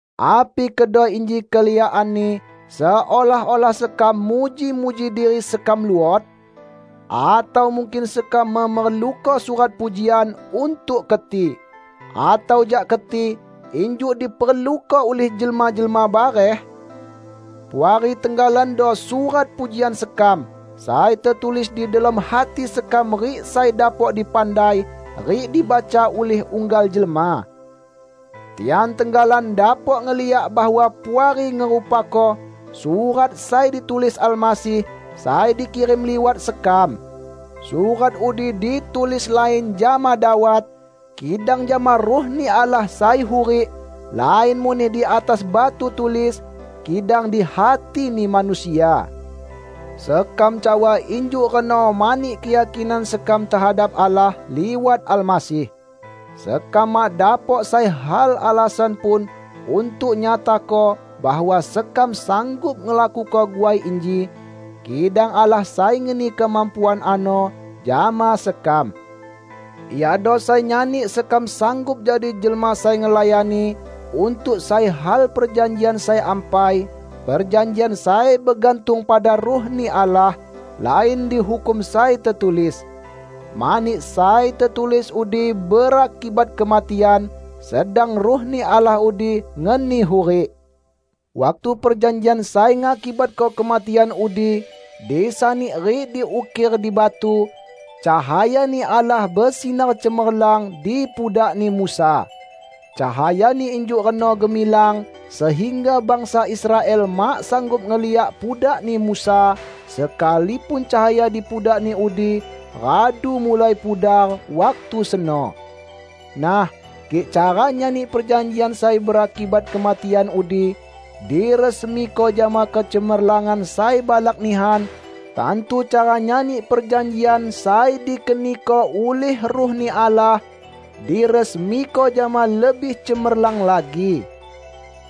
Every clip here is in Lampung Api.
Api kedo inji keliakanni seolah-olah sekam muji-muji diri sekam luot? Atau mungkin sekam memerluko surat pujian untuk keti, atau jak keti, injuk diperluko ulih jelma-jelma bareh? Puari tenggalando surat pujian sekam, sai tetulis di delom hati sekam rik sai dapok dipandai rik dibaca ulih unggal jelma. Tian tenggalan dapok ngeliak bahwa Puari ngerupako surat sai ditulis Almasih, sai dikirim liwat sekam. Surat udi ditulis lain jama dawat, kidang jama Ruh-Ni Allah sai hurik; lain muneh di atas batu tulis, kidang di hatini manusia. Sekam cawa injuk reno mani keyakinan sekam tehadap Allah liwat Almasih. Sekam mak dapok sai hal alasan pun untuk nyatako bahwa sekam sanggup ngelakuko guai inji, kidang Allah sai ngeni kemampuan ano jama sekam. Iado sai nyani sekam sanggup jadi jelma sai ngelayani untuk sai hal perjanjian sai ampai; perjanjian sai begantung pada Ruh-Ni Allah, lain dihukum sai tetulis. Mani sai tetulis udi berakibat kematian, sedang Ruh-Ni Allah udi ngeni hurik. Waktu perjanjian sai ngakibatko kematian udi disani rik diukir di batu, cahaya-Ni Allah besinar cemerlang di pudakni Musa. Cahayani injuk reno gemilang sehingga bangsa Israel mak sanggup ngeliak pudakni Musa, sekalipun cahaya di pudakni udi radu mulai pudar waktu seno. Nah, kik cara nyani perjanjian sai berakibat kematian udi diresmiko jama kecemerlangan sai balak nihan, tantu cara nyani perjanjian sai dikeniko ulih Ruh-Ni Allah, diresmiko jama lebih cemerlang lagi.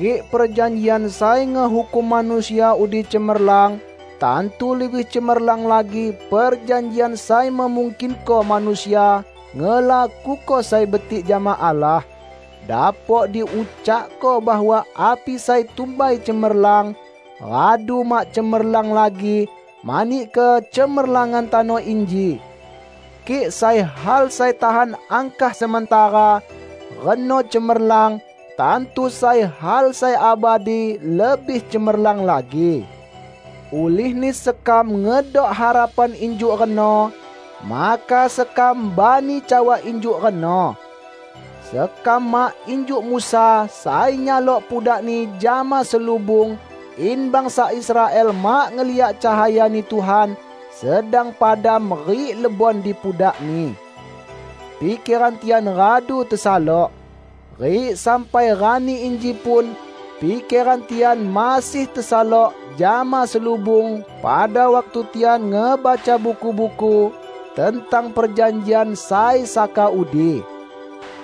Kik perjanjian sai ngehukum manusia udi cemerlang, tantu lebih cemerlang lagi perjanjian sai memungkinko manusia ngelakuko sai betik jama Allah. Dapok diucakko bahwa api sai tumbai cemerlang, radu mak cemerlang lagi mani kecemerlangan tano inji. Kik sai hal sai tahan angkah sementara, reno cemerlang, tantu sai hal sai abadi lebih cemerlang lagi. Ulihni sekam ngedok harapan injuk reno, maka sekam bani cawa injuk reno. Sekam mak injuk Musa sai nyalok pudakni jama selubung in bangsa Israel mak ngeliak cahaya-Ni Tuhan sedang padam rik lebon di pudakni. Pikeran tian radu tesalok. Rik sampai rani inji pun pikeran tian masih tesalok jama selubung pada waktu tian ngebaca buku-buku tentang perjanjian sai saka udi.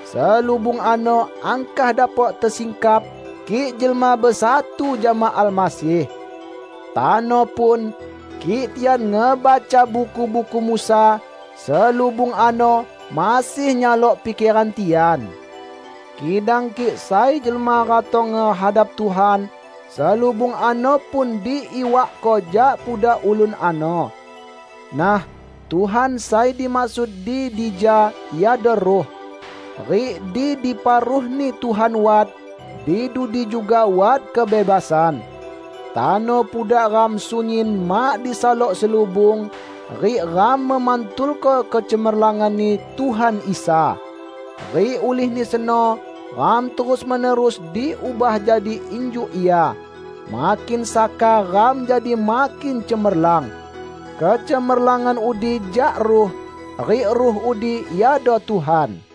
Selubung ano angkah dapok tesingkap kik jelma besatu jama Almasih. Tano pun, kik tian ngebaca buku-buku Musa, selubung ano masih nyalok pikeran tian. Kidang kik sai jelma ratong ngehadap Tuhan, selubung ano pun diiwakko jak pudak ulun ano. Nah, Tuhan sai dimaksud di dija iado Ruh. Rik di dipa Ruh-Ni Tuhan wat, di dudi juga wat kebebasan. Tano pudak ram sunyin mak disalok selubung, rik ram memantulko kecemerlangan-Ni Tuhan Isa. Rik ulihni seno ram terus-menerus diubah jadi injuk Ia; makin saka ram jadi makin cemerlang. Kecemerlangan udi jak Ruh, rik Ruh udi iado Tuhan.